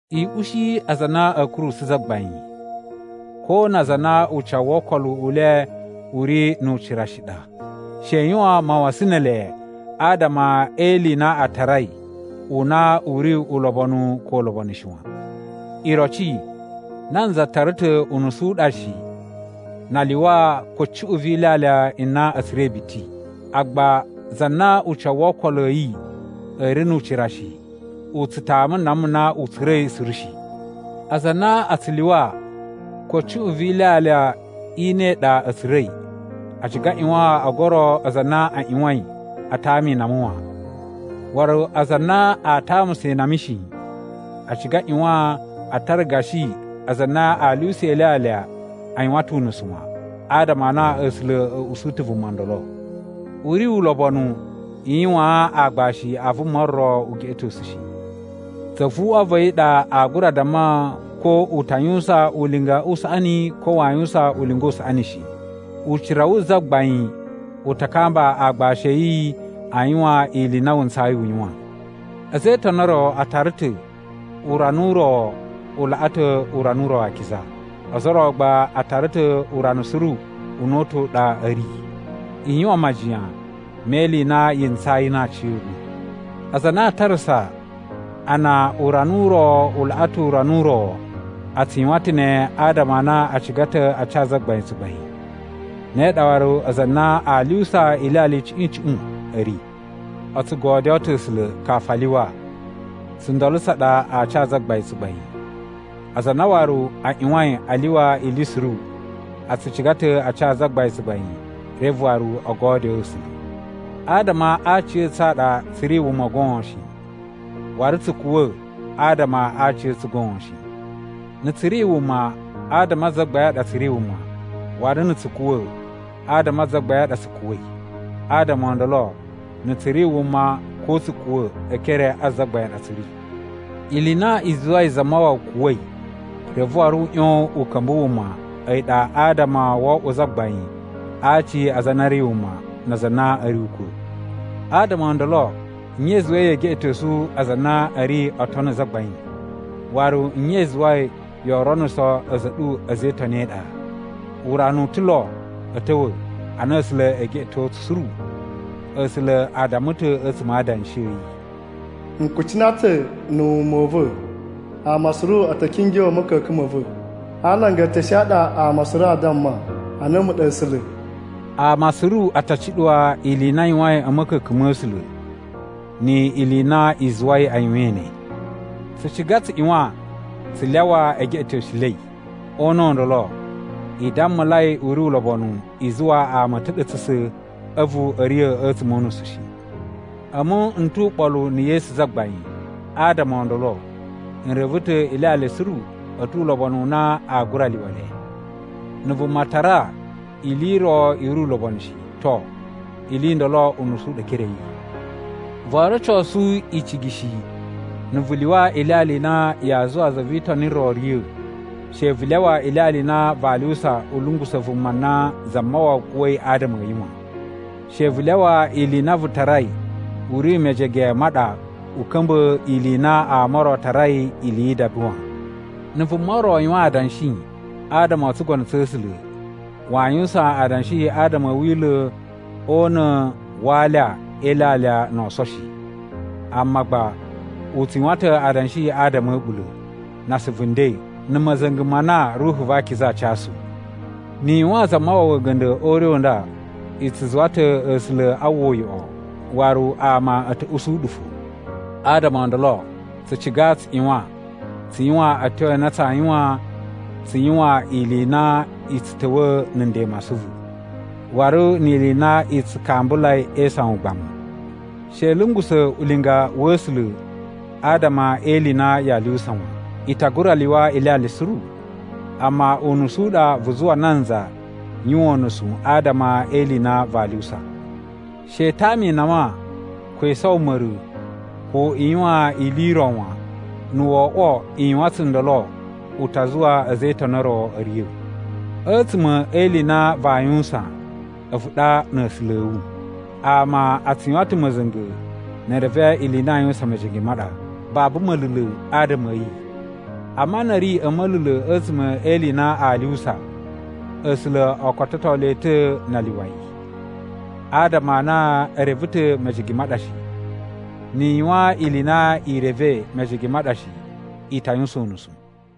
I ushi aza a na a̱ kurusu Zagbain, ko na aza a na ucawu wo okolo u le u ri nu ucira shi ɗa. She i yuwan mawasan ne ele adama e ili i na a tarai u na u ri ulobonu ko ulobonu shi wan. Iroci, nanza tara ta̱ unusu u ɗa shi na a lyuwa ko cuꞌun vi ilyalya i na a̱ tsura̱i biti. Agba za na ucawu wo okolo a̱ yi a̱ ri nu ucira shi, u tsu tama nama na u tsura̱i suru shi. Aza a na a tsu lyuwa ko cuꞌun vi ilyalya i ne ɗa a̱ tsura̱i, a ciga a ꞌyuwan o goro aza a na a ꞌyuwain a tama inama wan. Waru aza a na a tamusa inama shi, a ciga a ꞌyuwan a tara gashi aza a na a lyuwusa ilyalya a yuwan ta̱ unusu wan, adama a na A̱sula̱ a̱ usu ta̱ vuma ndolo. U ri ulobonu i yuwaan aagbashi a vuma ro ugeꞌetosu shi. Zavuꞌwa va̱ yi ɗa aa gura damma ko u ta yuwusan ulinga u saꞌani ko waa yuwusan ulinga u saꞌani shi. Ucira wu Zagbain u ta kamba aagbashi a̱ yi a yuwan ili i na wu ntsayi u yuwan. A̱za̱ e Itoni o ro a tara ta̱ urana u ro u laꞌa ta̱ urana u ro akiza, ozo o ro gba a tara ta̱ urana suru una̱ta̱ u ɗa a̱ ri. I yuwan majiyan me ili i na yi ntsayi na aciya̱ɗu. Aza a na a tarasa a na urana u ro u laꞌa ta̱ urana u ro, a tsu yuwan ta̱ ne adama a na a ciga ta̱ a ca Zagbain tsugbain. Ne ɗa waru aza a na a lyuwusa ilyalya icuꞌun icuꞌun a̱ ri. O tsu godyoo ta̱ A̱sula̱ kafu a lyuwa, tsundolo tsa ɗa aa ca Zagbain tsugbain. Aza a na waru a ꞌyuwain a lyuwa ili suru a tsu ciga ta̱ a ca Zagbain tsugbain reve waru o godyoo A̱sula̱. Adama a aciya̱tsu a ɗa tsu ri wuma goon shi, waru tsu kuwa̱ adama a aciya̱tsu goon shi. Na̱ tsu ri wuma, adama a Zagbain a ɗa tsu ri wuma, waru na̱ tsu kuwa̱, adama a Zagbain a ɗa tsu kuwa̱i. Adama o ndolo, na̱ tsu ri wuma ko tsu kuwa̱ e ekere a Zagbain a ɗa tsu ri. Ili i na i zuwai Zamawawa kuwa̱i reve waru u ꞌyon u ka̱mba̱ wuma a̱yi ɗa adama wo oꞌwo Zagbain a aci a aza a na a̱ ri wuma na aza a na a̱ ri ukwa̱. Adama o ndolo nye i zuwai yee geꞌetosu aza a na a̱ ri oo tono Zagbain? Waru nye i zuwai yoo ronuso a̱za̱ a̱ ɗu a̱za̱ e Itoni e iɗa? Urana u ta̱ lo a̱ ta̱wa̱ a na A̱sula̱ ee geꞌeto tsu suru. A̱sula̱ a damma ta̱ a̱tsuma̱ a Adanshi a̱ yi, “N kucina ta̱ na̱ wuma u va̱, ama suru a̱ ta̱ kingyo a̱ ma̱ka̱ka̱n ma̱ va̱. A alanga e eteshe a ɗa ama suru a damma a na a̱mu ɗa A̱sula̱.” Ama suru a ta cuɗuwa ili i na a yuwain a̱ ma̱ka̱ka̱n ma̱ A̱sula̱, ni ili i na i zuwai a yuwain ne. Tsu ciga tsu ꞌyuwan tsu lyawa e geꞌetosulei. O una̱ u ndolo, i dammulai u ri ulobonu i zuwa ama a̱ ta̱ɗa̱tsa̱ a̱vu a̱ riya̱ a̱tsuma̱ o unusu shi. A̱mu n tu uɓolu na̱ Yesu Zagbain, adama o ndolo n reve ta̱ ilyalya suru a̱ tu ulobonu u na a gura lyuwa le. Na̱ vuma tara ili i ro i ri ulobonu shi, to, ili i ndolo unusu u ɗa e ekere a̱ yi. Voo rocosu icigi shi na̱ vu lyuwa ilyalya i na yaa zuwa za vi Itoni ro riya̱. She vu lyawa ilyalya i na vaa lyuwusa u lungusa̱ vuma na Zamawawa kuwa̱i adama a̱ yi wan! She vu lyawa ili i na vu tarai u ri mejege ma ɗa u ka̱mba̱ ili i na ama o ro a tarai ili yi idaba wan. Na̱ vuma ro yuwan adanshi adama o tsugono tsa̱ A̱sula̱ waa yuwusan adanshi adama a̱ wila̱ o una̱ wa alya e ilyalya no oso shi, amma gba u tsu yuwan ta̱ adanshi adama a̱ a̱ɓula̱, na asuvu nden, na̱ ma̱za̱nga̱ ma na Ruhu va Akiza a casu. Ni i yuwaan Zamawawa a̱ga̱nda̱ o ure u nda, i tsu zuwa ta̱ A̱sula̱ a uwwa uyoꞌo waru ama a̱ ta̱ usu ɗu fo. Adama o ndolo, tsu ciga tsu ꞌyuwan tsu yuwan a̱tyo a na tsaa yuwan tsu yuwan ili i na i tsu ta̱wa̱a̱ na̱ nden ma asuvu, waru ni ili i na i tsu kambulai e isawan ugbamu. She i lungusa̱ ulinga wa̱ A̱sula̱ adama e ili i na yaa lyuwusa wan. I ta gura lyuwa ilyalya suru, amma unusu u ɗa vu zuwa nanza yuwan unusu adama e ili i na vaa lyuwusa. She i tama inama, ko i sowo ma̱ra̱, ko i yuwan ili i ro wan, na̱ wo oꞌwo i yuwan tsundolo u ta zuwa a̱za̱ e Itoni o ro a̱ riya̱. A̱tsuma̱ e ili i na vaa yuwusan a̱vu ɗa na̱ A̱sula̱ a̱ wu. Ama a tsu yuwan ta̱ ma̱za̱nga̱ ne e reve ili i na a yuwusan mejege ma ɗa, babu ma̱la̱la̱ adama a̱ yi. Amma na̱ a̱ ri a̱ ma̱la̱la̱ a̱tsuma̱ e ili i na aa lyuwusa, A̱sula̱ o kototo le ta̱ na a lyuwa yi, adama a na e reve ta̱ mejege ma ɗa shi. Ni i yuwan ili i na i revei mejege ma ɗa shi, i ta yuwusan unusu.